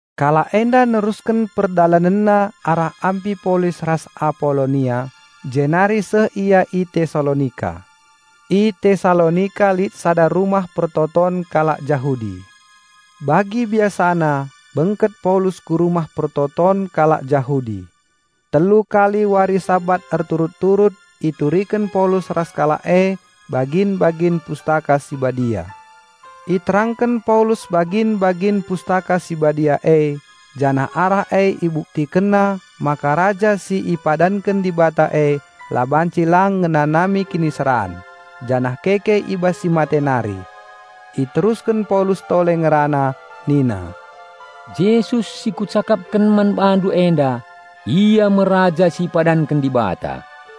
Kalak enda nerusken perdalanenna arah Ampipolis ras Apolonia jenari seh ia i Tesalonika. I Tesalonika lit sada rumah persembahen kalak Jahudi. Bagi biasana, bengket Paulus ku rumah persembahen kalak Jahudi. Telu kali wari Sabat erturut-turut ituriken Paulus ras kalak e bagin-bagin Pustaka Si Badia. Iterangken Paulus bagin-bagin Pustaka Si Badia e janah arah e ibuktikenna maka Raja si ipadanken Dibata e la banci lang ngenanami kiniseran janah keke i bas si mate nari. Iterusken Paulus tole ngerana nina, "Jesus si kucakapken man bandu enda, Ia me Raja si ipadanken Dibata."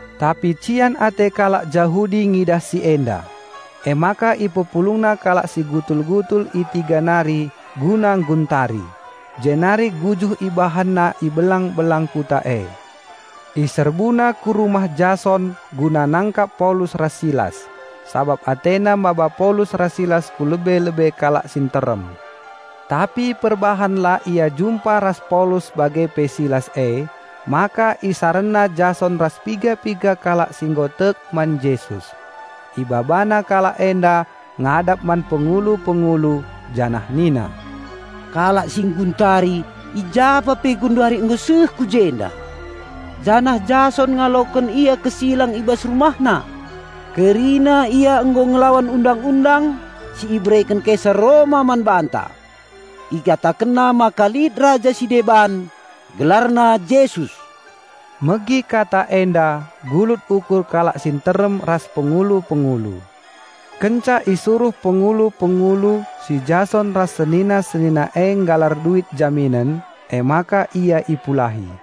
Tapi cian ate kalak Jahudi ngidah si enda. Emaka ipepulungna kalak si gutul-gutul i tiga nari guna ngguntari. Jenari gujuh ibahanna i belang-belang kuta e. Iserbuna ku rumah Jason guna nangkap Paulus ras Silas, sabap atena maba Paulus ras Silas ku lebe-lebe kalak si nterem. Tapi perbahan la ia jumpa ras Paulus bage pe Silas emaka isarenna Jason ras piga-piga kalak si nggo tek man Jesus. Ibabana kalak enda ngadap man pengulu-pengulu, janah nina, "Kalak si ngguntari i japa pe genduari nggo seh ku jenda, janah Jason ngaloken ia kesilang i bas rumahna. Kerina ia nggo ngelawan undang-undang si ibereken Kaisar Roma man banta. Ikatakenna maka lit raja si deban, gelarna Jesus." Megi kata enda gulut ukur kalak si nterem ras pengulu-pengulu. Kenca isuruh pengulu-pengulu si Jason ras senina-senina e nggalar duit jaminen emaka ia ipulahi.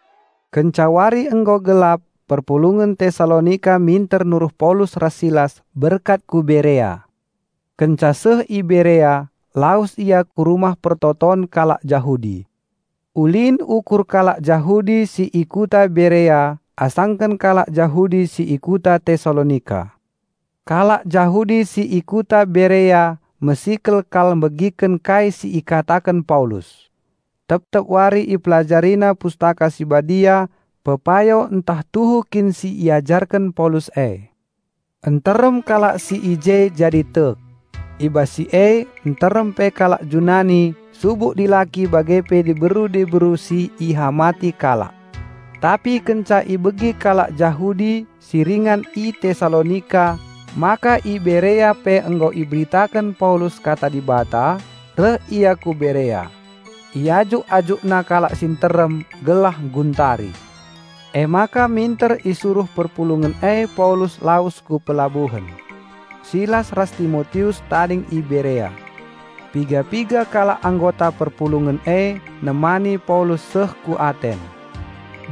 Kenca wari nggo gelap perpulungen Tesalonika minter nuruh Paulus ras Silas berkat ku Berea. Kenca seh i Berea lawes ia ku rumah persembahen kalak Jahudi. Ulin ukur kalak Jahudi si i kuta Berea asangken kalak Jahudi si i kuta Tesalonika. Kalak Jahudi si i kuta Berea mesikel kal megiken kai si ikataken Paulus. Tep-tep wari ipelajarina Pustaka Si Badia pepayo ntah tuhu kin si iajarken Paulus e. Nterem kalak si i je jadi tek. I bas si e nterem pe kalak Junani subuk dilaki bage pe diberu-diberu si ihamati kalak. Tapi kenca ibegi kalak Jahudi si ringan i Tesalonika maka i Berea pe nggo iberitaken Paulus Kata Dibata, reh ia ku Berea. Iajuk-ajukna kalak si nterem gelah ngguntari. Emaka minter isuruh perpulungen e Paulus lawes ku pelabuhen. Silas ras Timotius tading i Berea. Piga-piga kalak anggota perpulungen e nemani Paulus seh ku Aten.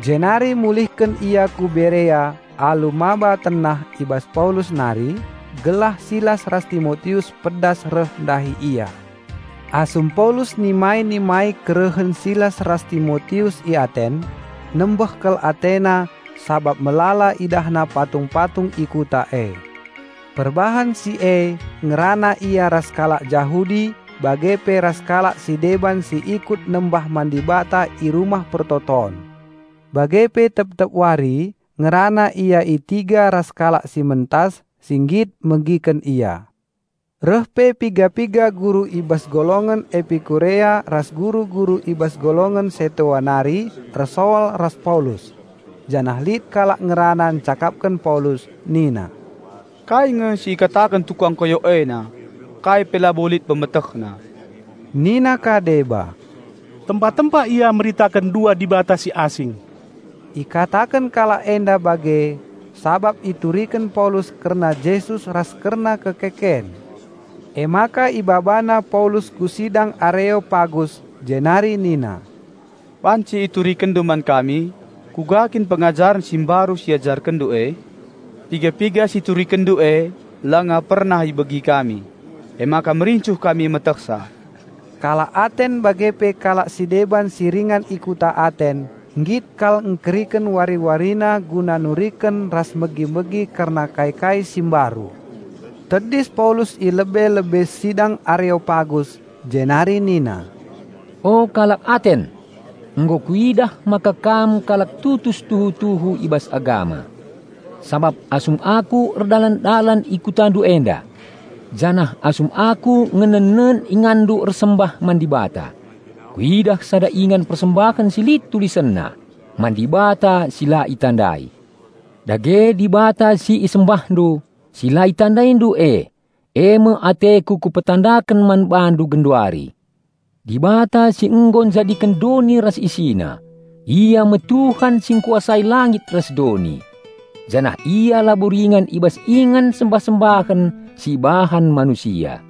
Jenari mulihken ia ku Berea alu maba tenah i bas Paulus nari gelah Silas ras Timotius pedas reh ndahi ia. Asum Paulus nima-nimai kerehen Silas ras Timotius i Aten, nembeh kal atena sabap melala idahna patung-patung i kuta e. Perbahan si e ngerana ia ras kalak Jahudi bage pe ras kalak si deban si ikut nembah man Dibata i rumah persembahen. Bage pe tep-tep wari ngerana ia i tiga ras kalak si mentas, si nggit megiken ia. Reh pe piga-piga guru i bas golongen Epikurea ras guru-guru i bas golongen Setoa nari ersoal ras Paulus. Janah lit kalak ngerana ncakapken Paulus nina, "Kai nge si ikataken tukang koyok ena? Kai pe labo lit pemetehna." Nina ka deba, "Tempa-tempa ia meritaken dua dibata si asing." Ikataken kalak enda bage sabap ituriken Paulus kerna Jesus ras kerna kekeken. Emaka ibabana Paulus ku sidang Areopagus jenari nina, "Banci iturikenndu man kami, kuga kin pengajaren si mbaru si iajarkenndu e? Piga-piga si iturikenndu e langa pernah ibegi kami, emaka merincuh kami metehsa." (Kalak Aten bage pe kalak si deban si ringan i Kota Aten nggit kal engkeriken wari-warina guna nuriken ras megi-megi kerna kai-kai si mbaru.) Tedis Paulus i lebe-lebe sidang Areopagus jenari nina, "O kalak Aten! Nggo kuidah maka kam kalak tutus tuhu-tuhu i bas agama. Sabap asum aku erdalan-dalan i kutandu enda, janah asum aku ngenennen inganndu ersembah man dibata, kuidah sada ingan persembahen si lit tulisenna, 'Man Dibata Si La Itandai'. Dage Dibata si isembahndu, si la itandaindu e, eme ateku ku petandaken man bandu genduari. Dibata si nggo njadiken doni ras isina, Ia me Tuhan si engkuasai langit ras doni. Janah Ia labo ringan i bas ingan sembah-sembahen si ibahan manusia.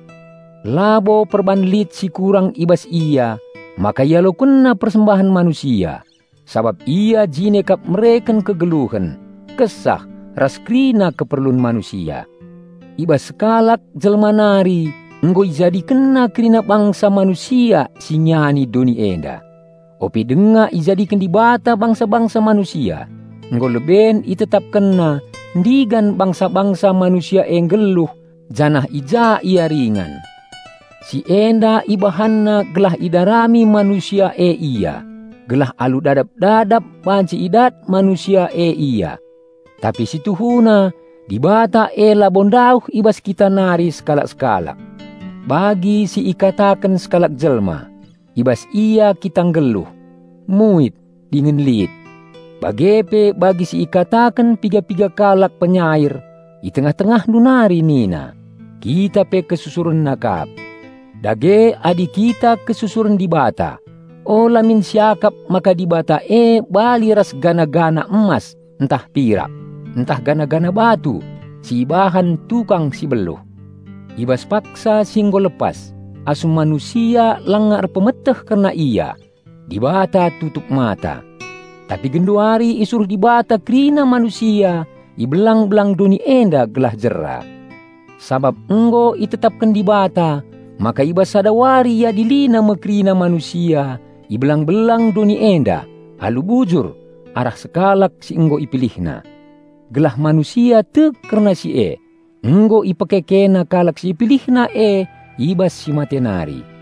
Labo perban lit si kurang i bas Ia maka IalokenNa persembahen manusia, sabap Ia jine kap mereken kegeluhen, kesah, ras kerina keperlun manusia. I bas sekalak jelma nari nggo IjadikenNa kerina bangsa manusia si ngiani doni enda. Ope denga ijadiken Dibata bangsa-bangsa manusia, nggo leben ItetapkenNa ndigan bangsa-bangsa manusia e nggeluh janah i ja ia ringan. Si enda IbahanNa gelah idarami manusia e Ia, gelah alu dadap-dadap banci idat manusia e Ia. Tapi si tuhuna Dibata e labo ndauh i bas kita nari sekalak-sekalak. Bagi si ikataken sekalak jelma, 'I bas Ia kita nggeluh, muit, dingen lit.' Bage pe bagi si ikataken piga-piga kalak penyair i tengah-tengahndu nari nina, 'Kita pe KesusurenNa kap.' Dage adi kita kesusuren Dibata, ula min siakap maka Dibata e bali ras patung emas ntah pirak, ntah patung batu si ibahan tukang si beluh. I bas paksa si nggo lepas, asum manusia langa erpemeteh kerna Ia, Dibata tutup mata. Tapi genduari isuruh Dibata kerina manusia i belang-belang doni enda gelah jera. Sabap nggo itetapken Dibata maka i bas sada wari IadiliNa me kerina manusia i belang-belang doni enda alu bujur arah sekalak si nggo IpilihNa. Gelah manusia tek kerna si e, nggo IpekekeNa kalak si IpilihNa e i bas si mate nari."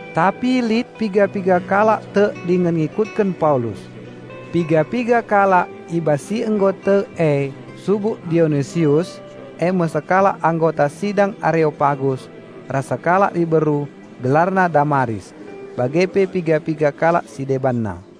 Tapi lit piga-piga kalak tek dingen ngikutken Paulus. Piga-piga kalak i bas si nggo tek e subuk Dionisius, eme sekalak anggota sidang Areopagus, ras sekalak diberu, gelarna Damaris, bage pe piga-piga kalak si debanna.